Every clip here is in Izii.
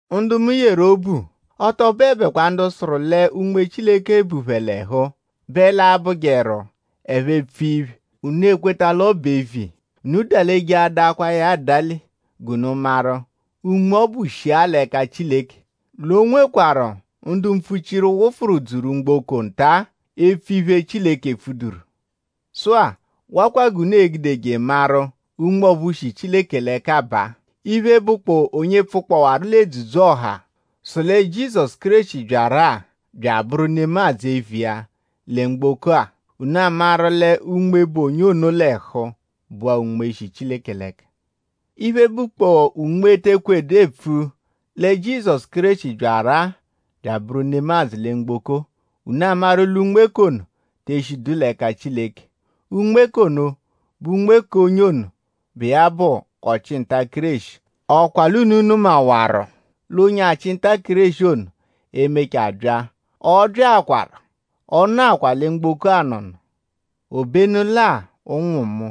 Ndu mu yeru obu; ọ tọ bụebekwa ndu sụru lẹ Unme Chileke bu phẹ l'ẹhu bẹ l'a-bụjeru ẹphe -pfua iphe; unu ekweta l'ọ bụ eviya. Unu dalejeadakwaa ya adale g'unu maru;?Unme ọbu shia l'ẹka Chileke? L'o nwekwarụ ndu mpfuchiru wụfuru dzuru mgboko nta-a epfu iphe, Chileke epfuduru. Sụ-a; wakwa g'unu e-gudeje maru Unme ọphu shi Chileke l'ẹka baa. Iphe, bụkpoo onye pfukpọwaru l'edzudzu-ọha sụ lẹ Jizọsu Kéreshi byaru-a bya abụru nemadzụ eviya lẹ mgboko-a; unu amaru lẹ Unme, bu onye ono l'ẹhu bụa Unme, shi Chileke l'ẹka. Iphe, bụkpoo unme te ekwejedu epfu lẹ Jizọsu Kéreshi byaru-a bya abụru nemadzụ lẹ mgboko; unu amaru l'unme k'ono te eshidu l'ẹka Chileke. Unme k'ono bụ unme k'onye ono, bụ iya bụ ọchi-nta-Kéreshi.?Ọ kwa l'unu nụmawaru l'onye-achị-nta-Kéreshi ono e-mechaa bya? Ọ byaakwaru. Ọ nọakwa lẹ mgboko anọno. Obenu lẹ-a; ụnwu mu;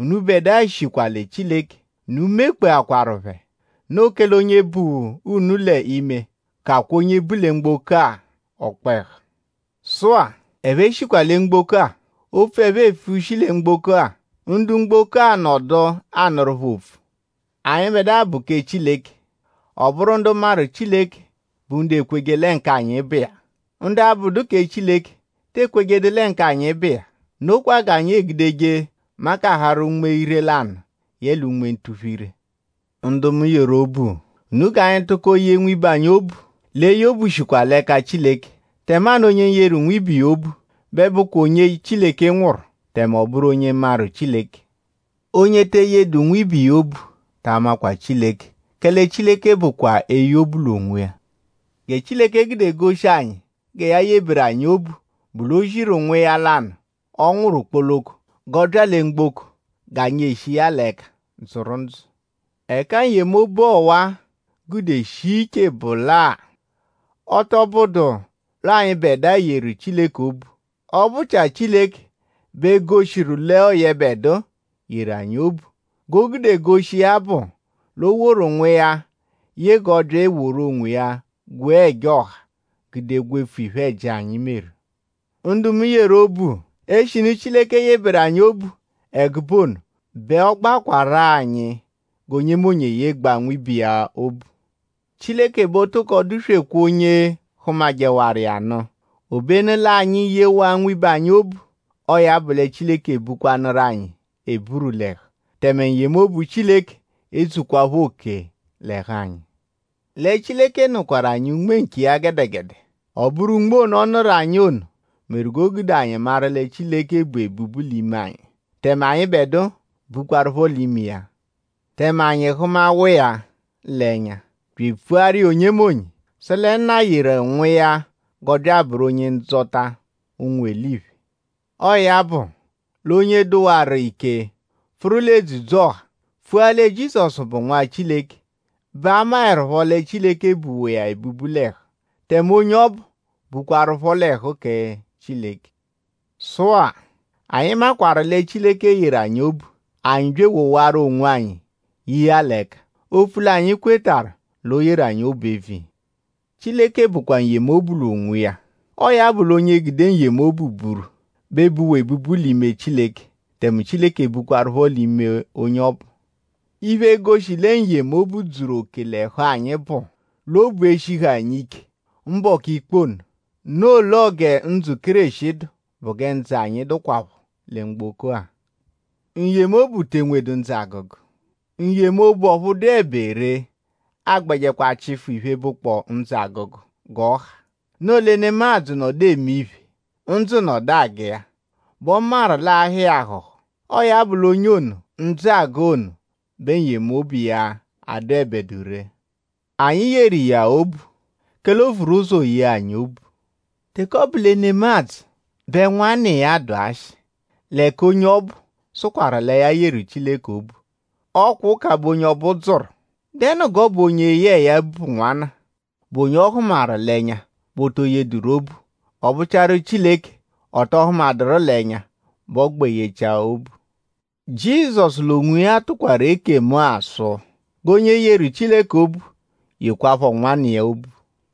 unubẹdua shikwa lẹ Chileke. Unu mekpeakwaru phẹ. Noo kẹle onye bu unu l'ime kakwaa onye bu lẹ mgboko-a ọkpehu. Sụ-a; ẹphe shikwa lẹ mgboko-a; opfu ẹphe epfu shi lẹ mgboko-a; ndu mgboko-a nọdu anụru phẹ opfu. Anyịbedua bụ kẹ Chileke. Ọ bụru ndu maru Chileke bụ ndu ekweje lẹ k'anyi bụ iya. Ndu abụdu kẹ Chileke te ekwejedu lẹ k'anyi bụ iya. Nokwa g'anyi egudeje makaharụ unme ire-lanụ yẹle unme ntuphu-ire. Ndu mu yeru obu; unu g'anyi tụko yee nwibe anyi obu l'eye obu shikwa l'ẹka Chileke; tẹmanu onye yeru nwibe iya obu bẹ bụkwa onye Chileke nwụru; tẹme ọ bụru onye maru Chileke. Onye te eyejedu nwibe iya obu ta amakwa Chileke; kẹle Chileke bụkwa eye obu l'onwiya. Gẹ Chileke gude goshi anyi gẹ ya yeberu anyi obu bụ l'o ziru Nwa iya lanụ, ọ nwụru kpoloko; g'ọ bya lẹ mgboko g'anyi eshi iya l'ẹka dzụru ndzụ. Ẹka n-yemobu ọwa-a gude shia iche bụ lẹ-a; ọ tọ bụdu l'ọo anyịbedua yeru Chileke obu; ọ bụ-chia Chileke bẹ goshiru l'ọo yẹbedua yeru anyi obu. G'o gude goshi iya bụ l'o woru Nwa iya ye g'ọ bya eworu onwiya gwee ẹja ọha; gude gwefu iphe-ẹji, anyi meru. Ndu mu yeru obu; eshinu Chileke yeberu anyi obu ẹgube ono bẹ ọ gbakwarụ-a anyi g'onyemonye eyegbaa nwibe iya obu. Chileke bẹ o tokọ dụ-swekwaa onye hụmajewaru iya nụ. Obenu lẹ-a; anyi -yewaa nwibe anyi obu; ọo ya bụ Chileke ebukwanụru anyi eburu l'ẹhu; tẹme n-yemobu Chileke edzuhukwaaphọ oke l'ẹhu anyi. Lẹ Chileke nụkwaru anyi Unme nkiya gẹdegede. Ọ bụru Unme ono, ọ nụru anyi ono meru g'o gude anyi maru lẹ Chileke bu ebubu l'ime anyi; tẹme anyịbedua bukwaruphọ l'ime iya. Tẹme anyi hụmawaa l'ẹnya; bya epfuru iya onyemonye sụ lẹ Nna yeru Nwa iya g'ọ bya abụru Onye-Ndzọta ụnwu eliphe. Ọo ya bụ l'onye dụwaru ike pfụru l'edzudzu-ọha; pfua lẹ Jizọsu bụ Nwa Chileke bẹ a maẹrupho lẹ Chileke buwa iya ebubu l'ẹhu; tẹme onye ọbu bukwaruphọ l'ẹhu kẹ Chileke. Sụ-a; anyi maakwaru lẹ Chileke yeru anyi obu; anyi bya ewowaru onwanyi ye iya l'ẹka; opfu l'anyi kwetarụ l'o yeru anyi obu eviya. Chileke bụkwa n-yemobu l'onwiya. Ọo ya bụ l'onye gude n-yemobu buru bẹ buwa ebubu l'ime Chileke; tẹme Chileke bukwaruphọ l'ime onye ọbu. Iphe e-goshi lẹ n-yemobu dzuru oke l'ẹhu anyi bụ l'obu e-shihu anyi ike mbọku ikpe ono. Noo l'ọo gẹ ndzụ Kéreshi dụ bụ gẹ ndzụ anyi dụkwapho lẹ mgboko-a. N-yemobu te enwedu ndzụ-agụgu. N-yemobu, ọphu dụebe ree agbẹjechikwa chịfu iphe, bụkpoo ndzụ-agụgu g'ọ ha. Noo lẹ nemadzụ -nọdu eme iphe; ndzụ nọdu agụ iya; bẹ ọ maru l'aa-hụ iya ahụ̀hù. Ọo ya bụ l'onye ono ndzụ agụ ono bẹ n-yemobu iya adụebedu ree. Anyi yeru iya obu; kẹle o vururọ ụzo yee anyi obu. Teke ọ bụ lẹ nemadzụ bẹ nwanna iya dụ ashị; l'ẹka onye ọbu sụkwaru lẹ ya yeru Chileke obu; ọ kwa ụka bẹ onye ọbu dzụru.?Dẹnu g'ọ bụ onye yẹe ya bụ nwanna, bụ onye ọ hụmaru l'ẹnya bẹ o to yedụru obu; ọ bụchiaru Chileke, ọ tọ hụmaduru l'ẹnya bẹ ọo-gbẹ yechia obu. Jizọsu l'onwiya tụkwaru ekemu-a sụ g'onye yeru Chileke obu yekwaaphọ nwanna iya obu.